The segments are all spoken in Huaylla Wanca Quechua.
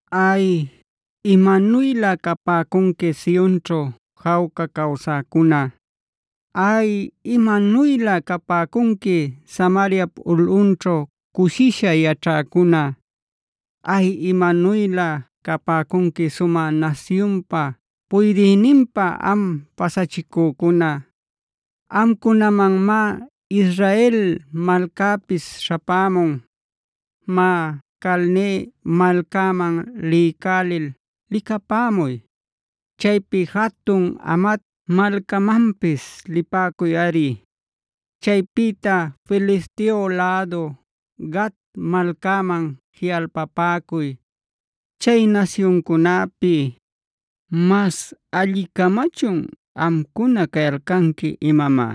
¡Ay, imanuylä capäcunqui Sionćhua jawca cawsäcuna! ¡Ay, imanuylä capäcunqui Samariap ulꞌunćhu cushisha yaćhäcuna! ¡Ay, imanuylä capäcunqui sumä nasyunpa puydïninpa am pasachicücuna; amcunamanmá Israel malcäpis śhapämun! Má, Calne malcaman liycälil licapämuy. Chaypi jatun Hamat malcamanpis lipäcuyꞌari. Chaypïta Filisteob lädu Gat malcaman jiꞌalpapäcuy. Chay nasyuncunäpi ¿mas alli-camachun amcuna cayalcanqui imamá?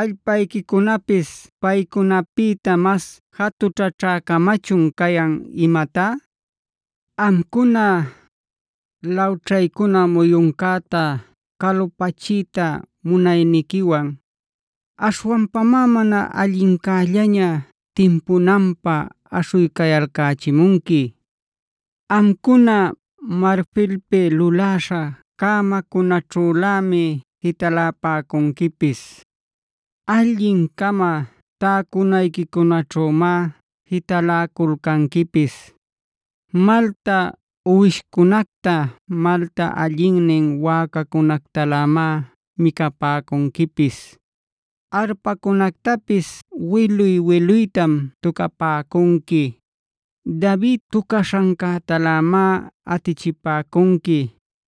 ¿Allpayquicunapis paycunapïta mas jatućhaćhä-camachun cayan imatá? Amcuna, lawćhaycuna muyuncäta calupachiyta munayniquiwan, aśhwanpamá mana allincällaña timpunanpä aśhuycayalcächimunqui. Amcuna marfilpi luläśha cämacunaćhülämi jitalapäcunquipis; allin-cama täcunayquicunaćhümá jitaläculcanquipis. Malta uwishcunacta, malta allinnin wäcacunactalämá micapäcunquipis. Arpacunactapis wiluy-wiluytam tucapäcunqui; David tucaśhantalämá atichipäcunqui.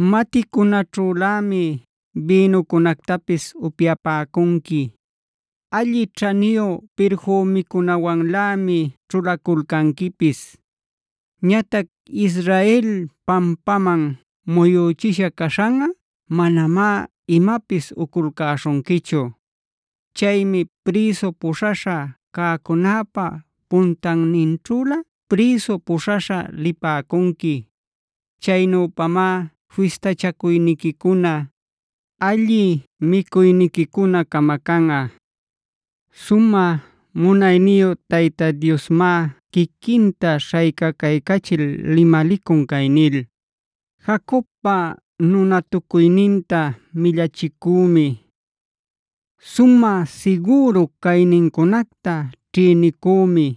Maticunaćhülämi bïnucunactapis upyapäcunqui. Alli ćhaniyu pirfümicunawanlämi ćhulaculcanquipis. Ñatac Israel pampaman muyüchisha caśhanꞌa manamá imapis uculcäśhunquichu. Chaymi prïsu puśhaśha cäcunäpä puntanninćhülä prïsu puśhaśha lipäcunqui. Chaynüpamá fistachacuyniquicuna, alli micuyniquicuna camacanꞌa. Sumä munayniyu Tayta Diosmá quiquinta śhaycacaycachil limalicun cay nil: “Jacobpa nunatucuyninta millachicümi. Sumä sigüru caynincunacta ćhïnicümi.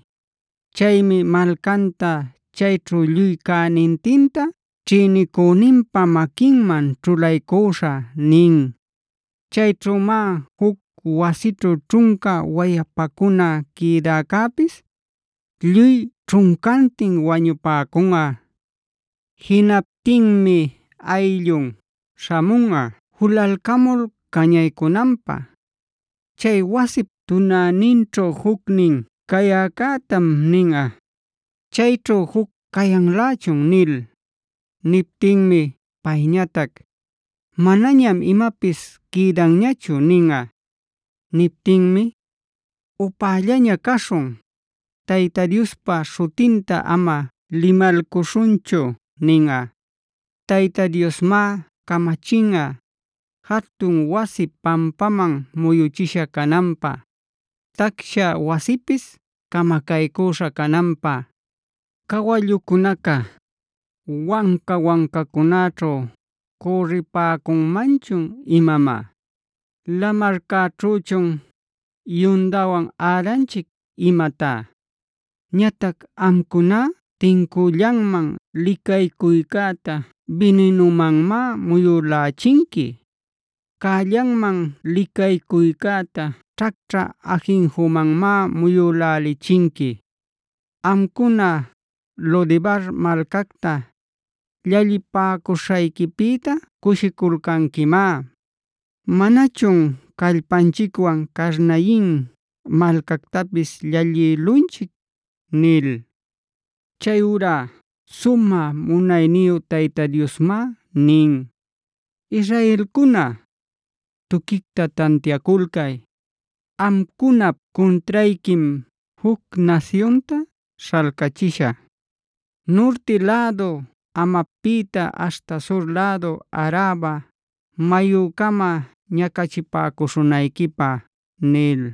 Chaymi malcanta chayćhu lluy cänintinta ćhïnicüninpa maquinman ćhulaycüśhä” nin. Chayćhümá juc wasićhu ćhunca wayapacuna quïdäcäpis lluy ćhuncantin wañupäcunꞌa. Jinaptinmi ayllun śhamunꞌa julalcamul cañaycunanpä. Chay wasip tunäninćhu jucnin cayäcätam ninꞌa: “Chayćhu juc cayanlächun” nil. Niptinmi payñatac: “Manañam imapis quïdanñachu” ninꞌa. Niptinmi: “Upällaña caśhun; Tayta Diospa śhutinta ama limalcuśhunchu” ninꞌa. Tayta Diosmá camachinꞌa, jatun wasi pampaman muyuchisha cananpä; tacsha wasipis camacaycüśha cananpä. ¿Cawallucunaca, wanca-wancacunäćhu cürripäcunmanchun imamá? ¿Lamarcäćhüchun yundawan äranchic imatá? Ñatac amcuná tincüllanman licaycuycäta bininumanmá muyülächinqui; cällanman licaycuycäta ćhacćhä ajinjumanmá muyülächinqui. Amcuna, Lodebar malcacta llallipäcuśhayquipïta cushiculcanquimá: “¿Manachun callpanchicwan Carnayin malcactapis llallïlunchic?” nil. Chayurá sumä munayniyu Tayta Diosmá nin: “Israelcuna, tuquicta tantiaculcay. Amcunap cuntrayquim juc nasyunta śhalcachishä, nurti lädu Hamatpïta aśhta sur lädu Araba mayucama ñacachipäcuśhunayquipä” nil.